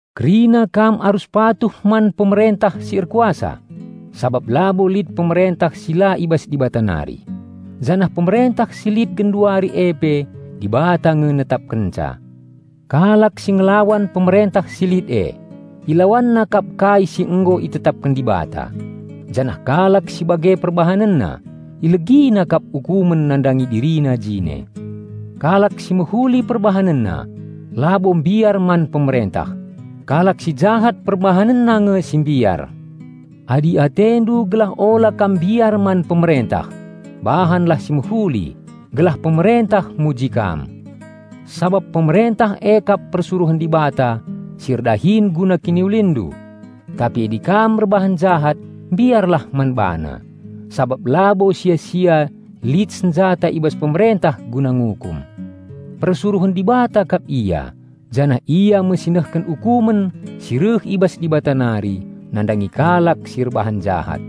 Kerina kam arus patuh man pemerentah si erkuasa, sabap labo lit pemerentah si la i bas Dibata nari, janah pemerentah si lit genduari e pe Dibata nge netapkenca. Kalak si ngelawan pemerentah si lit e, ilawanna kap kai si nggo itetapken Dibata, janah kalak si bage perbahanenna, ilegina kap ukumen nandangi dirina jine. Kalak si mehuli perbahanenna, labo mbiar man pemerentah; kalak si jahat perbahanenna nge si mbiar. Adi atendu gelah ula kam mbiar man pemerentah, bahanlah si mehuli, gelah pemerentah muji kam. Sabap pemerentah e kap persuruhen Dibata si erdahin guna kiniulinndu. Tapi adi kam erbahan jahat, mbiarlah man bana, sabap labo sia-sia lit senjata i bas pemerentah guna ngukum. Persuruhen Dibata kap ia janah ia me si nehken ukumen si reh i bas Dibata nari nandangi kalak si erbahan jahat.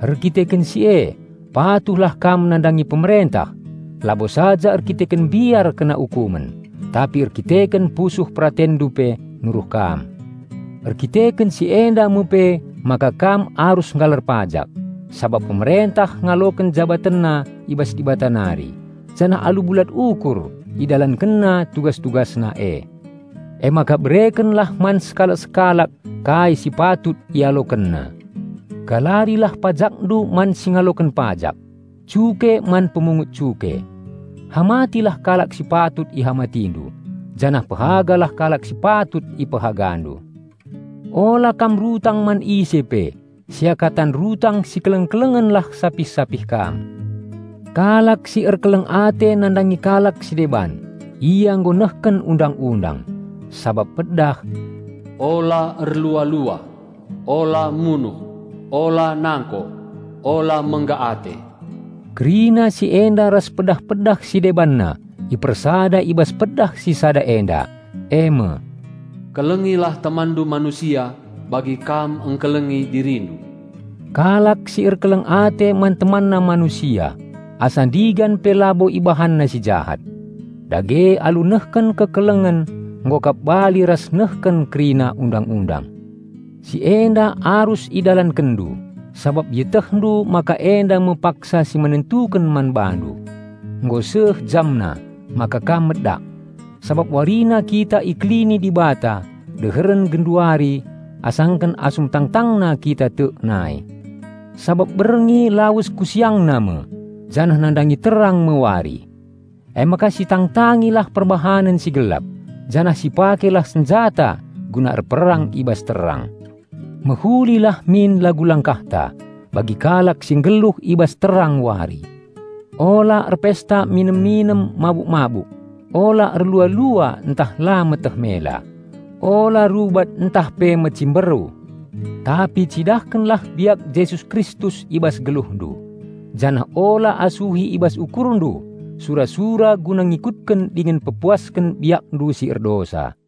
Erdandanken si e, patuhlah kam nandangi pemerentah, labo saja erdandanken mbiar kena ukumen, tapi erdandanken pusuh peratenndu pe nuruh kam. Erdandanken si enda me pe maka kam arus nggalar pajak, sabap pemerentah ngaloken jabatenna i bas Dibata nari, janah alu bulat ukur idalankenna tugas-tugasna e. Emaka berekenlah man sekalak-sekalak kai si patut ialokenna. Galarilah pajakndu man si ngaloken pajak, cuke man pemungut cuke. Hamatilah kalak si patut ihamatindu, janah pehagalah kalak si patut ipehagandu. Ula kam rutang man ise pe -- seakatan rutang sikeleng-kelenglah sapih-sapih kam. Kalak si erkeleng ate nandangi kalak si deban, ia nggo nehken Undang-undang. Sabap pedah "Ula erlua-lua; ula munuh; ula nangko; ula mengga ate;" -- kerina si enda ras pedah-pedah si debanna ipersada i bas pedah si sada enda, eme, "Kelengilah temanndu manusia bagi kam engkelengi dirindu." Kalak si erkeleng ate man temanna manusia asa ndigan pe labo ibahanna si jahat. Dage alu nehken kekelengen nggo kap bali ras nehken kerina Undang-undang. Si enda arus idalankenndu, sabap ietehndu maka enda me paksa si menentuken man bandu. Nggo seh jamna maka kam medak. Sabap warina kita ikelini Dibata deheren genduari asangken asum tangtangna kita tek nai. Sabap berngi lawes ku siangna me, janah nandangi terang me wari. Emaka sitangtangilah perbahanen si gelap, janah sipakelah senjata guna erperang i bas terang. Mehulilah min lagu langkahta, bagi kalak si nggeluh i bas terang wari; ula erpesta minem-minem mabuk-mabuk; ula erlua-lua ntah la meteh mela; ula rubat ntah pe mecimberu. Tapi cidahkenlah biak Jesus Kristus i bas geluhndu. Janah ula asuhi i bas ukurndu sura-sura guna ngikutken dingen pepuasken biakndu si erdosa.